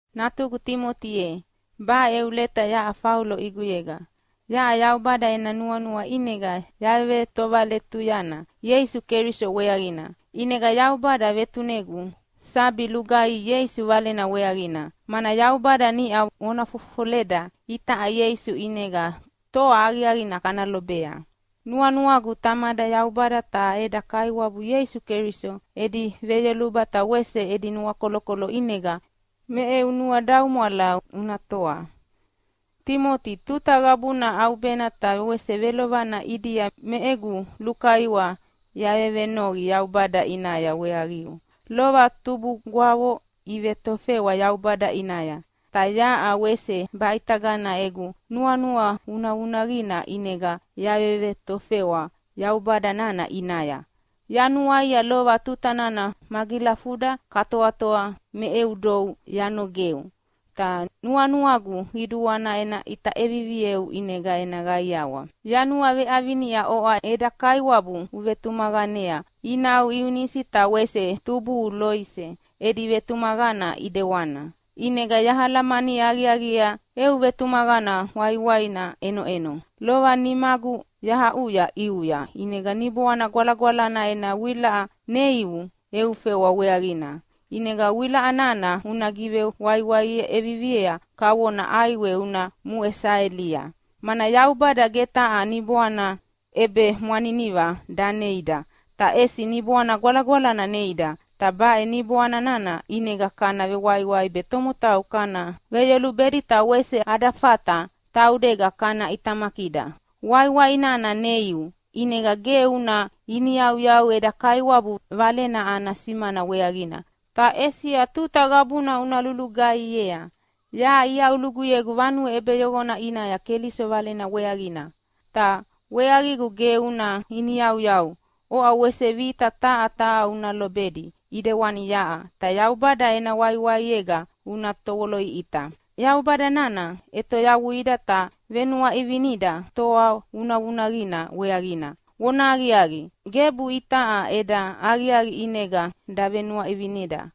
Natugu Timoti ye, baʼe eu leta yaʼa Faulo ʼiguyega. Yaʼa Yaubada ena nuanua ʼinega yavetovaletuyana Ieisu Keliso weaqina. ʼInega Yaubada vetunegu sabi lugaihi Ieisu Valena weaqina, mana Yaubada niʼa vona fofofoleda itaʼa Ieisu ʼinega toa aqiaqina kana lobea. Nuanuagu Tamada Yaubada ta eda Kaiwabu Ieisu Keliso edi veyoluba ta wese edi nuakolokolo ʼinega me eu nuadaumwala una toa. Timoti, tuta qabuna ʼaubena ta wese velovelovana ʼidia me egu lukaiwa yavevenoqi Yaubada ʼinaya weaqiu. Lova tubugwavo ivetofewa Yaubada ʼinaya, ta yaʼa wese baʼitagana egu nuanua vunavunaqina ʼinega yavevetofewa Yaubada nana ʼinaya. Yanuaia lova tuta nana magilafuda katoatoa me eu dou yanogeu. Ta nuanuagu qiduana ena ʼita ʼevivieu ʼinega ena qaiawa. Yanuaveʼavinia oʼa eda Kaiwabu uvetumaqanea inau Iunisi ta wese tubuhu Loise edi vetumaqana ʼidewana. ʼInega yahalamani aqiaqiea eu vetumaqana waiwaina ʼenoʼeno. Lova nimagu yahaʼuya ʼiuya ʼinega Niboana Gwalagwalana ena wilaʼa neiu eu fewa weaqina. ʼInega wilaʼa nana una givewaiwai ʼeviviea kavona ʼaiwe una muʼe saelia. Mana Yaubada ge taha niboana ʼebemwaniniva daneida, ta ʼesi Niboana Gwalagwalana neida, ta baʼe Niboani nana ʼinega kana vewaiwai be tomotau kana veyolubedi ta wese ada fata taudega kana ʼitamakida. Waiwai nana neiu, ʼinega ge una iniyauyau eda Kaiwabu Valena ana simana weaqina, ta ʼesi tuta qabuna una lulugaihiea. Yaʼa iaʼuluguyegu vanue ʼebeyoqona ʼinaya Keliso Valena weaqina, ta weaqigu ge una iniyauyau. Oʼa wese vita taha taha una lobedi ʼidewani yaʼa, ta Yaubada ena waiwaiega una tovoloʼiʼita. Yaubada nana ʼetoyavuida ta venuaʼivineda toa vunavunaqina weaqina. Vonahaqiaqi, gebu itaʼa eda aqiaqi ʼinega davenuaʼivineda,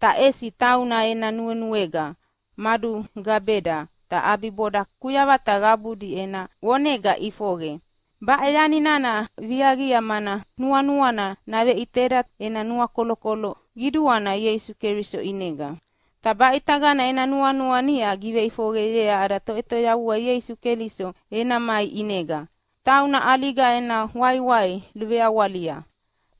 ta ʼesi tauna ena nuenuega madugabeda ta ʼabiboda kuyavata qabudi ena vonega iʼifoqe. Baʼe yani nana viaqia mana nuanuana naveʼiteda ena nuakolokolo qiduana Ieisu Keliso ʼinega. Ta baʼitagana ena nuanua niʼa giveʼifoqeyea ada Toʼetoyavua Ieisu Keliso ena mai ʼinega. Tauna ʼaliga ena waiwai luveawalia,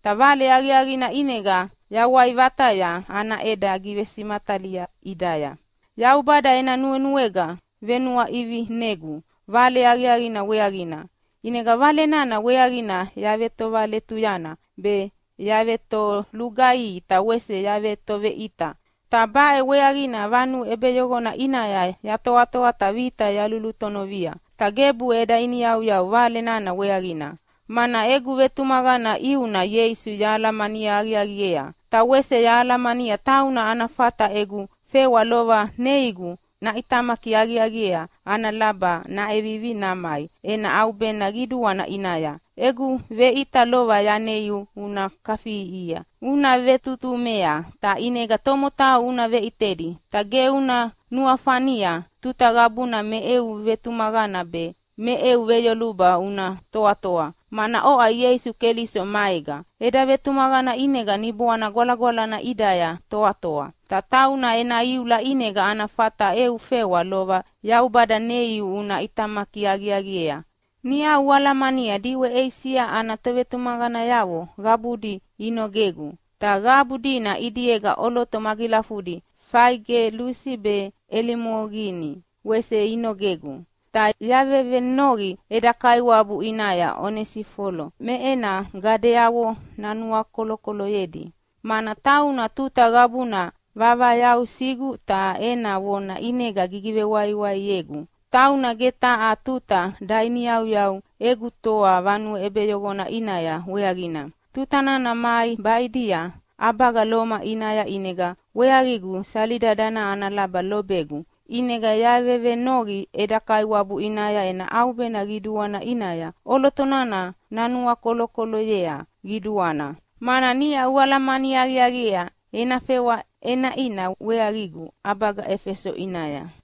ta Vale Aqiaqina ʼinega yawai vataya ana ʼeda givesimatalia ʼidaya. Yaubada ena nuenuega venuaʼivinegu Vale Aqiaqina weaqina. ʼInega Vale nana weaqina yavetovaletuyana be, yavetolugaihi ta wese yavetoveʼita. Ta baʼe weaqina vanue ʼebeyoqona ʼinaya yatoatoa ta vita yalulutonovia. Ta gebu eda iniyauyau Vale nana weaqina, mana egu vetumaqana ʼiuna Ieisu yahalamani aqiaqiea. Ta wese yahalamania tauna ana fata egu fewa lova neigu naʼitamaki aqiaqiea ana laba naʼevivi namai ena ʼaubena qiduana ʼinaya. Egu veʼita lova yaneiu una kafiʼiʼihia ta una vetutumei ta ʼinega tomotau una veʼitedi. Ta ge una nuafania tuta qabuna me eu vetumaqana be me eu veyoluba una toatoa, mana oʼa Ieisu Keliso maega. Eda vetumaqana ʼinega Niboana Gwalagwalana ʼidaya toatoa. Ta tauna ena iula ʼinega ana fata eu fewa lova Yaubada neiu una ʼitamaki aqiaqiea. Niʼau ualamania diʼwe Eisia ana tovetumaqanayavo qabudi inogegu, ta qabu dina ʼidiega ʼoloto magilafudi Faigelusi be Elimogini wese inogegu. Ta yavevenoqi eda Kaiwabu ʼinaya Onesifolo me ena gadeavo nanuakolokoloyedi, mana tauna tuta qabuna vavayausigu ta ena vona ʼinega givewaiwaiegu. Tauna ge taha tuta dainiyauyau egu toa vanue ʼebeyoqona ʼinaya weaqina. Tuta nana mai baʼidia ʼabaga Loma ʼinaya ʼinega weaqigu sali dadana ana laba lobegu. ʼInega yavevenoqi eda Kaiwabu ʼinaya ena ʼaubena qiduana ʼinaya ʼoloto nana nanuakolokoloyea qiduana. Mana niʼa ualamani aqiaqiea ena fewa ʼenaʼina weaqigu ʼabaga Efeso ʼinaya.